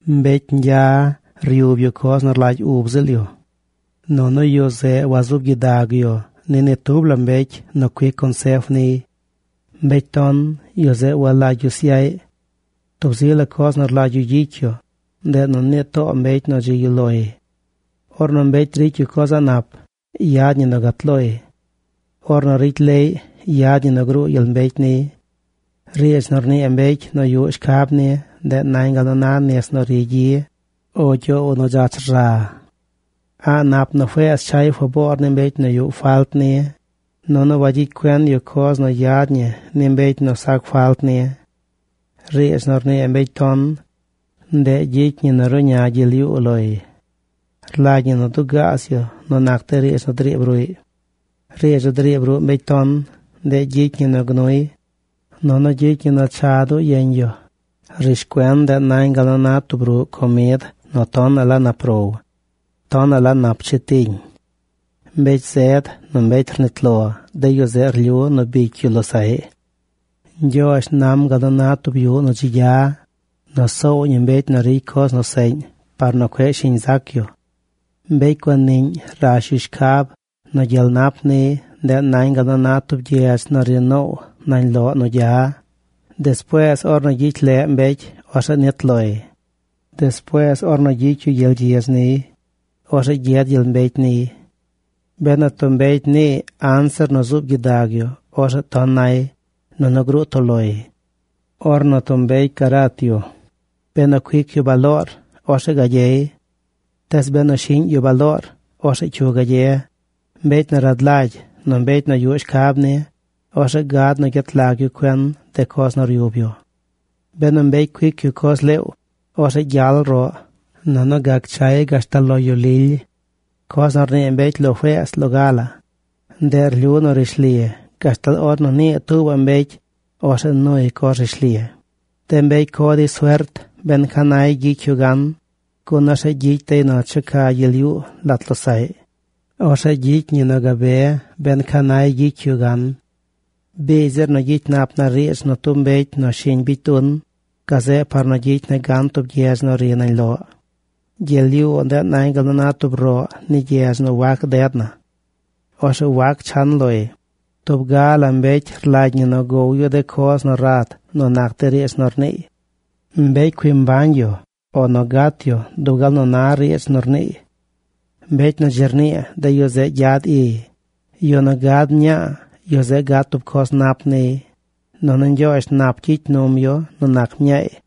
Mbecy ñgya ryub yu coz nu rlagy ub ziꞌl yu. Nunu yu zeꞌ wazuub gyidag yu ni ni tub la mbecy nu cuic consef niy. Mbecy ton, yu zeꞌ walagy yu syaꞌy. Tub zi la coz nu rlagy yu gyicy yu, ndeꞌ nu nii too mbecy nu dzi yuꞌ loy. Ornu mbecy ricy yu coz a̱ꞌ nap, yad ñi nu gat loy. Ornu ricy leꞌy, yad ñi nu gruu gyel mbecy niy. Riidz nu rnii mbecy nu yuꞌ shcab ni, ndeꞌ nañ gal na nis nu ri gyi, o gyoow nu dzach rza. A̱ꞌ nap nu feez chay faboor ni mbecy nu yuꞌ falt ni, nunu wagyicy cuen yu coz nu yad ñi ni mbecy nu sac falt ni. Riidz nu rnii mbecy ton, ndeꞌ ricy ñi nu ruꞌña gyel yuu loy. Rlagy ñi nu dugaaz yu nu nac de riidz nu driib ruꞌy. Riidz nu driib ruꞌ mbecy ton, ndeꞌ gyicy ñi nu gnuy, nunu gyicy ñi nu cha duu yeñ yu. Rishcuen, ndeꞌ nañ gal nu na tub ruꞌ comid nu tonaꞌ la nap row. Tonaꞌ la nap chetiñ. Mbecy zed nu mbecy nu rnit lo, de yu zeꞌ rlyu nu bicy yu losaꞌy. Ñgyoozh nam gal nu na tub yuꞌ nu dzi gya nu soow ñi mbecy nu ricy coz nu seꞌñ par nu cueꞌ shiñ zac yu. Mbecy guaniꞌñ rash yu shcab nu gyel nap niy. Ndeꞌ nañ gal na tub gyedz nu ri noow nañ loꞌ nu gya. Despuees ornu gyicy leꞌ mbecy, orzeꞌ nit loy. Despuees ornu bicy yu gyel gyidz niy, orzeꞌ gyed gyel mbecy niy. Benu tub mbecy niiy anzir nu zub gyidag yu, orzeꞌ ton nay, nunu gruu toꞌ loy. Ornu tub mbecy garat yu, benu cuic yu baloor, orzeꞌ gagyey. Tees benu shiꞌñ yu baloor, orzeꞌ ¿cyu gagye? Mbecy nu rad lagy, nu mbecy nu yuꞌ shcab ni, orzeꞌ gad nu gyet lag yu cuen de coz nu ryub yu. Benu mbecy cuic yu coz leew, orzeꞌ gyal roꞌ, nunu gac chay gashtal lo yu lily. Coz nu rnii mbecy lo feez loga la, ndeꞌ rlyu nu rishli gashtal ornu nii tuubaꞌ mbecy. Orzeꞌ nuy coz rishli. De mbecy co dey suert ben ca nay gyicy yu gan, gun orzeꞌ gyicy dey nu checa gyel yuu lat losaꞌy. Orzeꞌ gyicy ñi nu gabe ben ca nay gyicy yu gan. Biigy zir nu gyicy nap na riidz nu tub mbecy nu shiñ bicy dun, gazeꞌ par nu gyicy na gan tub gyedz nu ri nañ loꞌ. Gyel yuu ndeꞌ nañ gal na tub roꞌ ni gyedz nu wac ded na. Orzeꞌ wac chan loy. Tub ga la mbecy rlagy ñi nu gow yu de coz nu rad nu nac de riidz nu rniiy. Mbecy cui mbañ yu o nu gat yu dub gal nu na riidz nu rniiy. Mbecy nu dzi rnii, de yu zeꞌ gyad iy. Yu nu gad mñaa, yu zeꞌ gad tub coz nap niy, nunu Ñgyoozh nap gyicy num yu nu nac mñaay.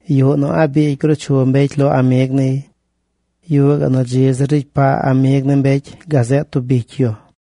Yuꞌ nu a̱ꞌ biigy gruu chu mbecy lo amig niy. Yuꞌ gaꞌ nu dzi zir ricy paa amig ni mbecy gazeꞌ tub bicy yu.